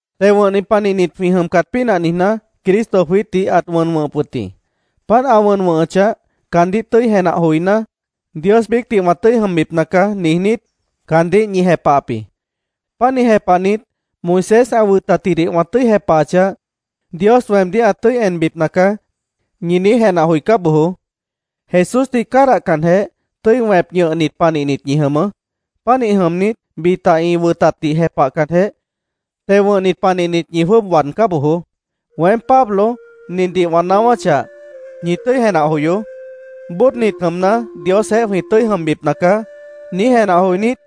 Teo wʉ̃hnit panihnit jwĩ jʉmcat pínah niijná, Cristo jwiítdih ãt wʉn wʉ̃hʉp wʉt jĩ. Páant ã wʉn wʉ̃hʉchah, “Caandíh tʉ́i jenah joiná, Dios biícdih wã tʉ́i jʉmbipna caá”, niijnít, caandíh ñi jepahap jĩ. Pánih jepahnit, “Moisés ã wʉtatjidih wã tʉ́i jepahachah, Dios weemdíh ã tʉ́i enbipna caá”, ñi niíj jenah joicá bojoó. Jesúsdih cádahcanjeh, tʉ́i wẽp ñʉhnit panihnit ñi jʉmʉʉ́. Pánih jʉmnit, bita ĩ wʉtatdih jepahcanjeh, teo wʉ̃hnit panihnit ñi jwʉ́ʉb waadcá bojoó. Weém, Pablo, nindih wã naáwáchah, ñi tʉ́i jenah joyoó: “Bóodnit jʉmna, Diosjeéh jwĩ tʉ́i jʉmbipna caá”, niíj jenah joinít,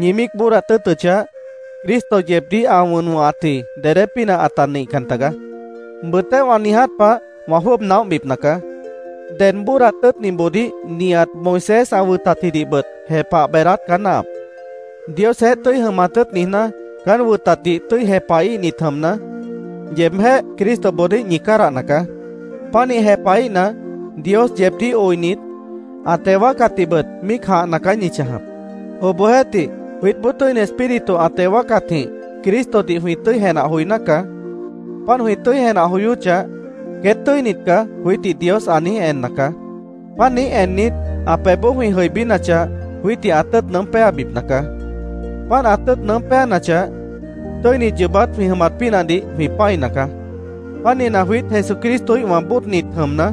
ñi míic bóodat tʉ́ʉtʉchah, Cristo yeebdíh ã wʉn wʉ̃hatji dedé pínah ãta nihcan tagaá. Bʉʉtéh wã niiját pah, wã jwʉ́ʉb naóhbipna caá. Ded bóodat tʉ́ʉtniboodíh nihat Moisés ã wʉtatjidihbʉt jepah beedáát caá náahap. Diosjeéh tʉ́i jʉmat tʉ́ʉt niijná, caán wʉtatdih tʉ́i jepahíhnit jʉmna, yeebjéh Cristoboodíh ñi cádahna caá. Pánih jepahíhna, Dios yeebdíh oinit, ã teo wáacatdihbʉt míic jãhna caá ñi chãjap. Obohjeéhtih, jwiítboó Tʉ́ini Espíritu ã teo wáacatjĩh Cristodih jwĩ tʉ́i jenah joiná caá. Páant jwĩ tʉ́i jenah joyóchah, “Queét tʉ́init caá”, jwiítdih Dios ã niíj enna caá. Páant niíj ennit, ã pebhboó jwĩ jʉibínachah, jwiítdih ã tʉ́ʉt nʉʉ́m péabipna caá. Páant ã tʉ́ʉt nʉʉ́m péanachah, tʉ́init yoobát jwĩ jʉmat pínahdih jwĩ pã́ina caá. Pánihna, jwiít Jesucristoíhwã bóodnit jʉmna,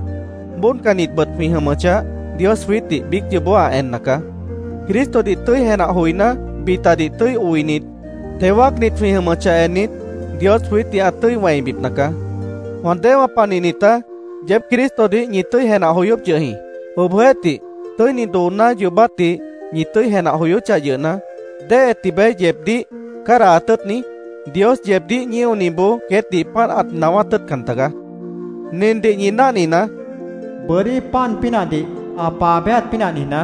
bóodcannitbʉt jwĩ jʉmʉchah, Dios jwiítdih biíc yoobó ã enna caá. Cristodih tʉ́i jenah joiná, bitadih tʉ́i oinit, teo wáacnit jwĩ jʉmʉchah ennit, Dios jwiítdih ã tʉ́i wẽibipna caá. Wã déewã panihnitá, yeéb Cristodih ñi tʉ́i jenah joyóp yʉh jĩ. Obohjeéhtih, tʉ́ini dooná yoobátdih ñi tʉ́i jenah joyóchah yʉhna, ¿déhe tibeé yeebdíh cádahat tʉ́ʉtni? Dios yeebdíh ñíoniboó queétdih páant ãt naáwát tʉ́ʉtcan tagaá. Nindih ñi náhninaá: Bʉ́dí pan pínahdih ã paa béjat pínah niijná,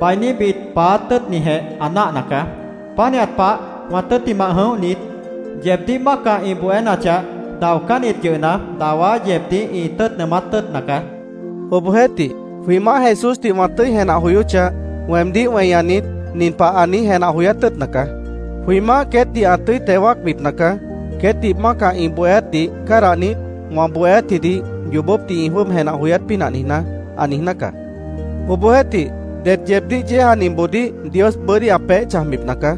bainíbit paáát tʉ́ʉtnijeh ã náahna caá. Pánihat pah, wã tʉ́ttimah jʉ̃óhnit, yeebdíh mácah ĩ bohénachah, daocánnit yʉhna, dawá yeebdíh ĩ tʉ́ʉt nʉʉmát tʉ́ʉtna caá. Obohjeéhtih, jwĩ Maáh Jesúsdih wã tʉ́i jenah joyóchah, weemdíh weñanit, nin pah ã niíj jenah joyát tʉ́ʉtna caá: “Jwĩ Maáh queétdih ã tʉ́i teo wáacbipna caá, queétdih mácah ĩ bohéátdih cádahnit, wã bohéátjidih yoobópdih ĩ jwʉ́ʉb jenah joyát pínah niijná”, ã niijná caá. Obohjeéhtih, ded yeebdíh yéejaniboodíh Dios bʉ́dí ã peéh chãjbipna caá.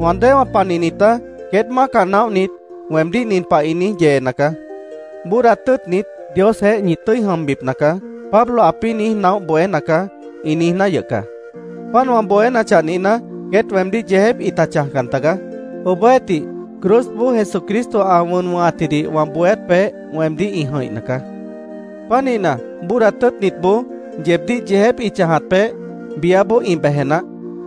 Wã déewã panihnitá, queét mácah naóhnit weemdíh nin pah ĩ niíj yeena caá: “ ‘Bóodat tʉ́ʉtnit, Diosjeéh ñi tʉ́i jʉmbipna caá’, Pablo ãpĩ́ niíj naóh bohéna caá”, ĩ niijná yʉh caá. Páant wã bohénachah nihna, queét weemdíh yeejép ĩta chãjcan tagaá. Obohjeéhtih, cruzboó Jesucristo ã wʉn wʉ̃hatjidih wã bohéát peéh weemdíh ĩ jʉ̃ihna caá. Pánihna, bóodat tʉ́ʉtnitboó, yeebdíh yeejép ĩ chãjat peéh, biáboó ĩ beje naáh.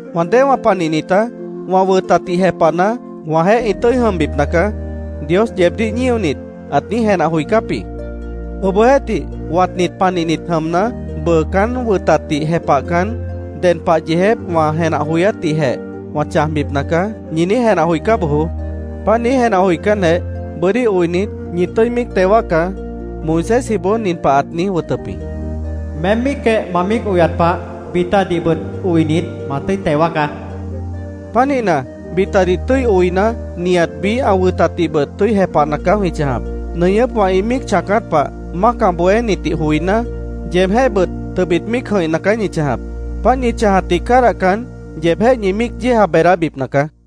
Wã déewã panihnitá, “Wã wʉtatdih jepahna, wãjeéh ĩ tʉ́i jʉmbipna caá”, Dios yeebdíh ñíonit, ãt niíj jenah joicáp jĩ. Obohjeéhtih, watnit panihnit jʉmna, “Bʉʉ caán wʉtatdih jepahcan, ded pah yeejép wã jenah joyátdihjeh wã chãjbipna caá”, ñi niíj jenah joicá bojoó. Páant niíj jenah joicánjeh, bʉ́dí oinit, ñi tʉ́i míic teo wáacá. Moisésjiboó nin pah ãt niíj wʉtʉp jĩ: “Meém míicjeh ma míic oyat pah, bitadihbʉt oinit, ma tʉ́i teo wáacá”, ãt niijíp jĩ. Pánihna, bitadih tʉ́i oina, nihat biíh ã wʉtatdihbʉt tʉ́i jepahna caá jwĩ chãjap. Nʉñʉ́pwã ĩ míic chãacát pah, mácah bohénitdih joiná, yeebjéhbʉt tʉbit míic jʉ̃ihna caá ñi chãjap. Páant ñi chãjatdih cádahcan, yeebjéh ñi míic yéeja beedábipna caá.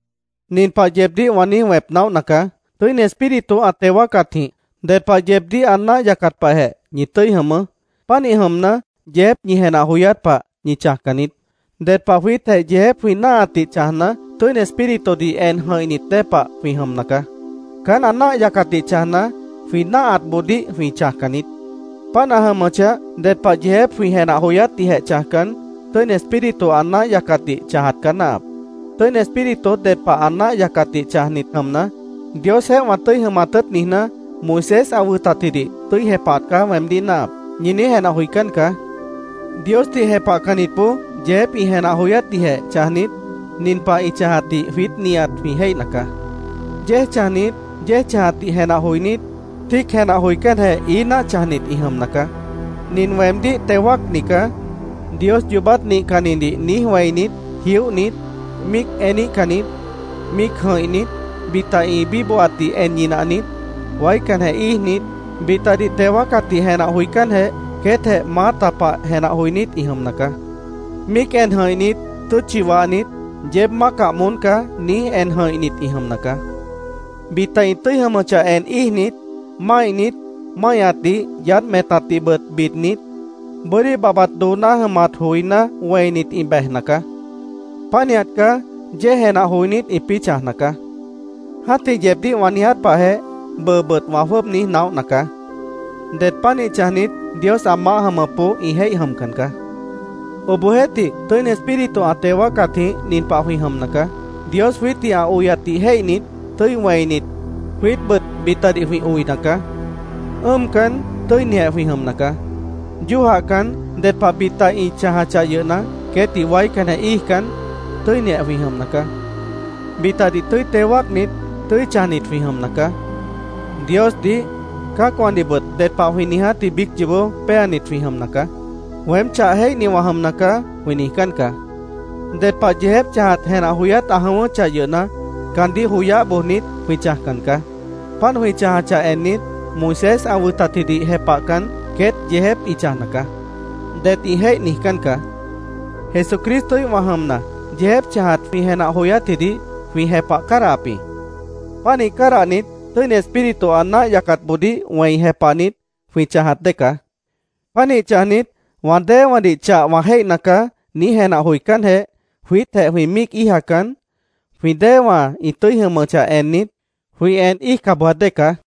Nin pah yeebdíh wã niíj wẽp naóhna caá: Tʉ́ini Espíritu ã teo wáacatjĩh ded pah yeebdíh ã náah yacat pahjeh ñi tʉ́i jʉmʉʉ́. Pánih jʉmna, yeejép ñi jenah joyát pah ñi chãjcan niít. Ded pah jwiítjeh yeejép jwĩ náahatdih chãjna, Tʉ́ini Espíritudih en jʉ̃ihnit dée pah jwĩ jʉmna caá. Caán ã náah yacatdih chãjna, jwĩ náahatboodíh jwĩ chãjcan niít. Páant ã jʉmʉchah, ded pah yeejép jwĩ jenah joyátdihjeh chãjcan, Tʉ́ini Espíritu ã náah yacatdih chãjat caá náahap. Tʉ́ini Espíritu ded pah ã náah yacatdih chãjnit jʉmna, “Diosjeéh wã tʉ́i jʉmat tʉ́ʉt niijná, Moisés ã wʉtatjidih tʉ́i jepahat caá weemdíh náahap”, ñi niíj jenah joicán caá. Diosdih jepahcannitboó yeejép ĩ jenah joyátdihjeh chãjnit, nin pah ĩ chãjatdih jwiít nihat jwĩ jéihna caá: Yéej chãjnit, yéej chãjatdih jenah joinít, tíic jenah joicánjeh ií náah chãjnit ĩ jʉmna caá. “Nin weemdíh teo wáacni caá”, Dios yoobát nihcannidih niíj wẽinit, jióhnit, míic eníhcannit, míic jʉ̃ihnit, bita ĩ bíbohatdih en ñinahnit, waícanjeh íijnit, bitadih teo wáacatdih jenah joicánjeh, queétjeh maáta pah jenah joinít ĩ jʉmna caá. Míic en jʉ̃ihnit, tʉ́tchi wahnit, “Yeéb mácah moón caá”, niíj en jʉ̃ihnit ĩ jʉmna caá. Bita ĩ tʉ́i jʉmʉchah en íijnit, máihnit, máihñatdih yaádh metatdihbʉt bidnit, bʉ́dí babhbat dooná jʉmat joiná wẽinit ĩ bejna caá. Pánihat caá yéej jenah joinít, ĩpĩ́ chãjna caá. Jã́tih yeebdíh wã niiját pahjeh, bʉʉbʉt wã jwʉ́ʉb niíj naóhna caá: Det pánih chãjnit Dios ã maáh jʉmʉpboó ĩ jéih jʉmcan caá. Obohjeéhtih, Tʉ́ini Espíritu ã teo wáacatjĩh nin pah jwĩ jʉmna caá: Dios jwiítdih ã oyatdih jéihnit, tʉ́i wẽinit, jwiítbʉt bitadih jwĩ oina caá. Ʉ́ʉmcan, tʉ́inijeh jwĩ jʉmna caá. Yójahcan, ded pah bita ĩ chãjachah yʉhna, queétdih waícanjeh íijcan, tʉ́inijeh jwĩ jʉmna caá. Bitadih tʉ́i teo wáacnit, tʉ́i chãjnit jwĩ jʉmna caá. Diosdih, cã́acwãdihbʉt ded pah jwĩ niijátji biíc yoobó péanit jwĩ jʉmna caá. “Weém chah jéihni wã jʉmna caá”, jwĩ niijcán caá. Ded pah yeejép chãjat jenah joyát ã jʉ̃ʉ́wʉ́chah yʉhna, caandíh joyáh bojnit, jwĩ chãjcan caá. Páant jwĩ chãjachah ennit, “Moisés ã wʉtatjidih jepahcan, queét yeejép ĩ chãjna caá”, det ĩ jéih niijcán caá. Jesucristoíhwã jʉmna, yeejép chãjat jwĩ jenah joyátjidih jwĩ jepah cádahap jĩ. Pánih cádahnit, Tʉ́ini Espíritu ã náah yacatboodíh wẽi jepahnit, jwĩ chãjat dée caá. Pánih chãjnit, “Wã déewãdih chah wã jéihna caá”, niíj jenah joicánjeh, jwiítjeh jwĩ míic íijacan, jwĩ déewã ĩ tʉ́i jʉmʉchah ennit, jwĩ en íijca bojat dée caá.